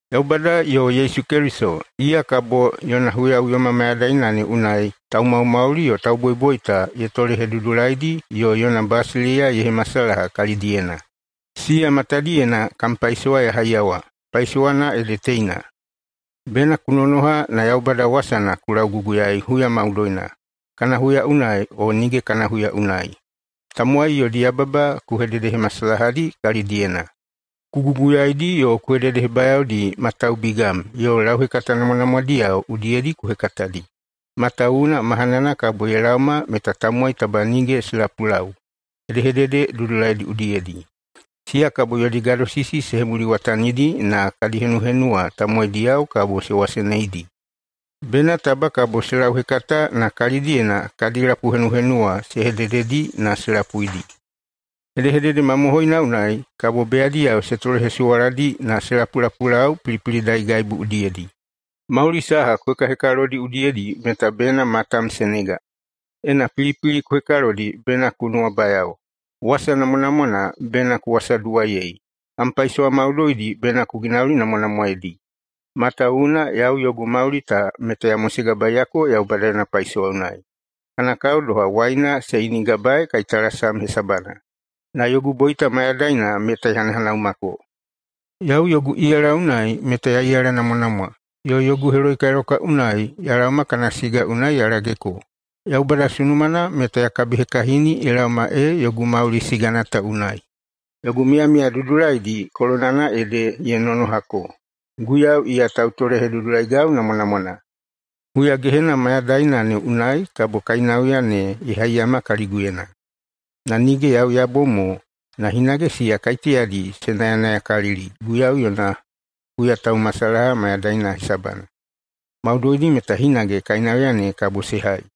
Yaubada yo Yesu Keliso, iya kabo yona huyaꞌuyoma mayadaina ne unai taumaumauli yo tauboiboita ye tolehedudulaidi yo yona basileiya ye hemasalaha kalidaena, siya matadiyena kam paisowa ya haiyawa. Paisowana ede teina: Bena ku nonoha na Yaubada wasana ku lauguguyaei huya maudoina, kana huya unai o nige kana huya unai. Tamowai yodi yababa ku hededehemasalahadi kalidiyena. Ku guguyaidi yo ku hededehebayaodi ma taubigam yo lauhekata namwanamwadiyao udiyedi ku hekatadi. Matawuwuna mahanana kabo ye laoma meta tamowai taba nige se lapulau hedehedede dudulaidi udiyedi. Siya kabo yodi gadosisi se hemuliwatanidi na kadi henuhenuwa tamowaidiyao kabo se waseneidi, bena taba kabo se lauhekata na kalidiyena kadi lapuhenuhenuwa se hedededi na se lapuidi. Hedehedede mamohoina unai kabo beyadiyao se tolehesuwaladi na se lapulapulau pilipilidaigaibu udiyedi. Mauli saha ku hekahekalodi udiyedi meta bena matam se nega. Ena pilipili ku hekalodi bena ku nuwabayao. Wasa namwanamwana bena ku wasaduwaiyei. Kam paisowa maudoidi bena ku ginaulinamwanamwaedi. Matawuwuna yau yogu mauli ta meta ya mosegabaeyako Yaubada yona paisowa unai, kana kao doha waina se inigabaei kaitalasam hesabana, na yogu boita mayadaina meta ye hanahanaumako. Yau yogu iyala unai meta ya iyalanamwanamwa, yo yogu heloikailakwa unai ya laoma kana siga unai ya lageko. Yaubada sunumana meta ya kabihekahini ye laoma ee yogu mauli sigana ta unai. Yogu miyamiya dudulaidi kolonana ede ye nonohako. Guiyau, iya tautolehedudulai namwanamwana, huyagehena mayadaina ne unai kabo kainauya ne ye haiyama kaliguyena. Na nige yau ya bom mo, na hinage siya kaiteyadi se nayanayakalili Guiyau yona huyataumasalaha mayadaina hesabana, maudoidi meta hinage kainauya ne kabo se hai.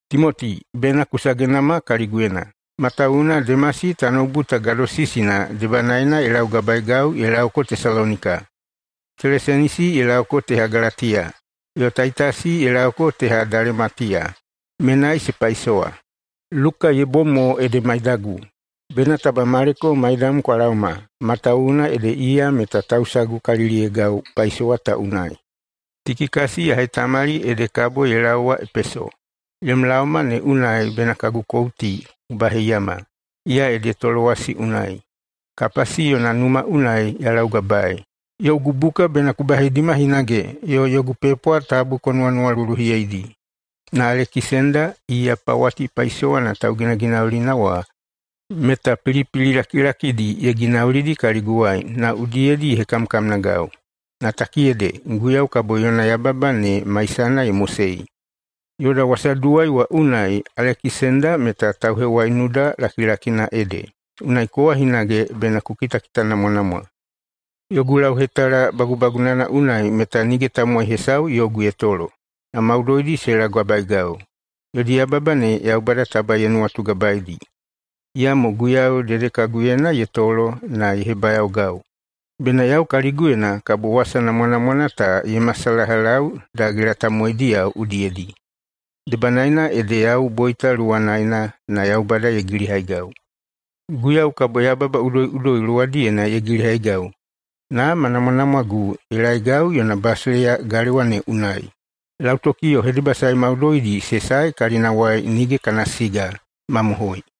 Timoti, bena ku sagenama kaliguyena, matawuwuna Demasi tanoubu ta gadosisina debanaena ye laugabaegau ye laoko Tesalonika. Kelesenisi ye laoko teha Galatiya, yo Taitasi ye laoko teha Dalematiya, menai se paisowa. Luka ye bom mo ede maidagu. Bena taba Maleko maidam kwa laoma, matawuwuna ede iya meta tausagukaliliyeigau paisowa ta unai. Tikikasi ya hetamali ede kabo ye laowa Epeso. Yom laoma ne unai bena kagu kouti ku baheiyama. Iya ede Tolowasi unai, Kapasi yona numa unai ya laugabaei. Yogu buka bena ku baheidima hinage, yo yogu pepwa tabu ku nuwanuwaluluhiyeidi. Na Alekisenda, iya pawati paisowana tauginaginaulina wa, meta pilipili lakilakidi ye ginaulidi kaliguwai na udiyedi ye hekamkamnagau. Na takiyede, Guiyau kabo yona yababa ne maisana ye mosei. Yoda wasaduwai wa unai Alekisenda meta tauhewaiunuda lakilakina ede. Unai kowa hinage bena ku kitakitanamwanamwa! Yogu lauhetala bagubagunana unai meta nige tamowai hesau yogu ye tolo, na maudoidi se laugabaegau. Yodi yababa ne Yaubada taba ye nuwatugabaedi. Iyamo Guiyau dedekaguyena ye tolo na ye hebayaogau, bena yau kaliguyena kabo wasa namwanamwana ta ye masalahalau dagela tamowaidiyao udiyedi. Debanaena ede yau boita luwanaena na Yaubada ye gilihaigau. Guiyau kabo yababa udoiꞌudoi luwadiyena ye gilihaigau na ma namwanamwagu ye laeigau yona basileiya galewa ne unai. Lautoki yo hedebasae maudoidi se sae kalinawai nige kana siga. Mamohoi!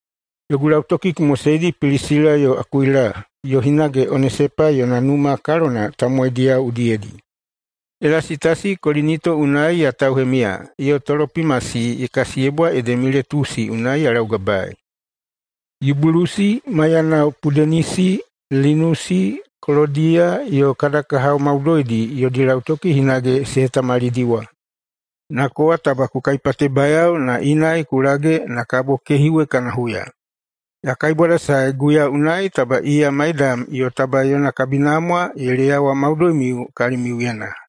Yogu lautoki ku moseidi Pilisila yo Akuila, yo hinage Onesepa yona numa kalona tamowaidiyao udiyedi. Elasitasi Kolinito unai ya tauhemiya, yo Tolopimasi ye kasiyebwa ede Miletusi unai ya laugabaei. Yubulusi maiyanao Pudenisi, Linusi, Kolodiya yo kada kahao maudoidi yodi lautoki hinage se hetamalidiwa. Na kowa taba ku kaipatebayao na inai ku lage na kabo kehiwe kana huya. Ya kaibwadasae Guiyau unai taba iya maidam yo taba yona kabinamwa ye leyawa maudoimiu kalimiuyena.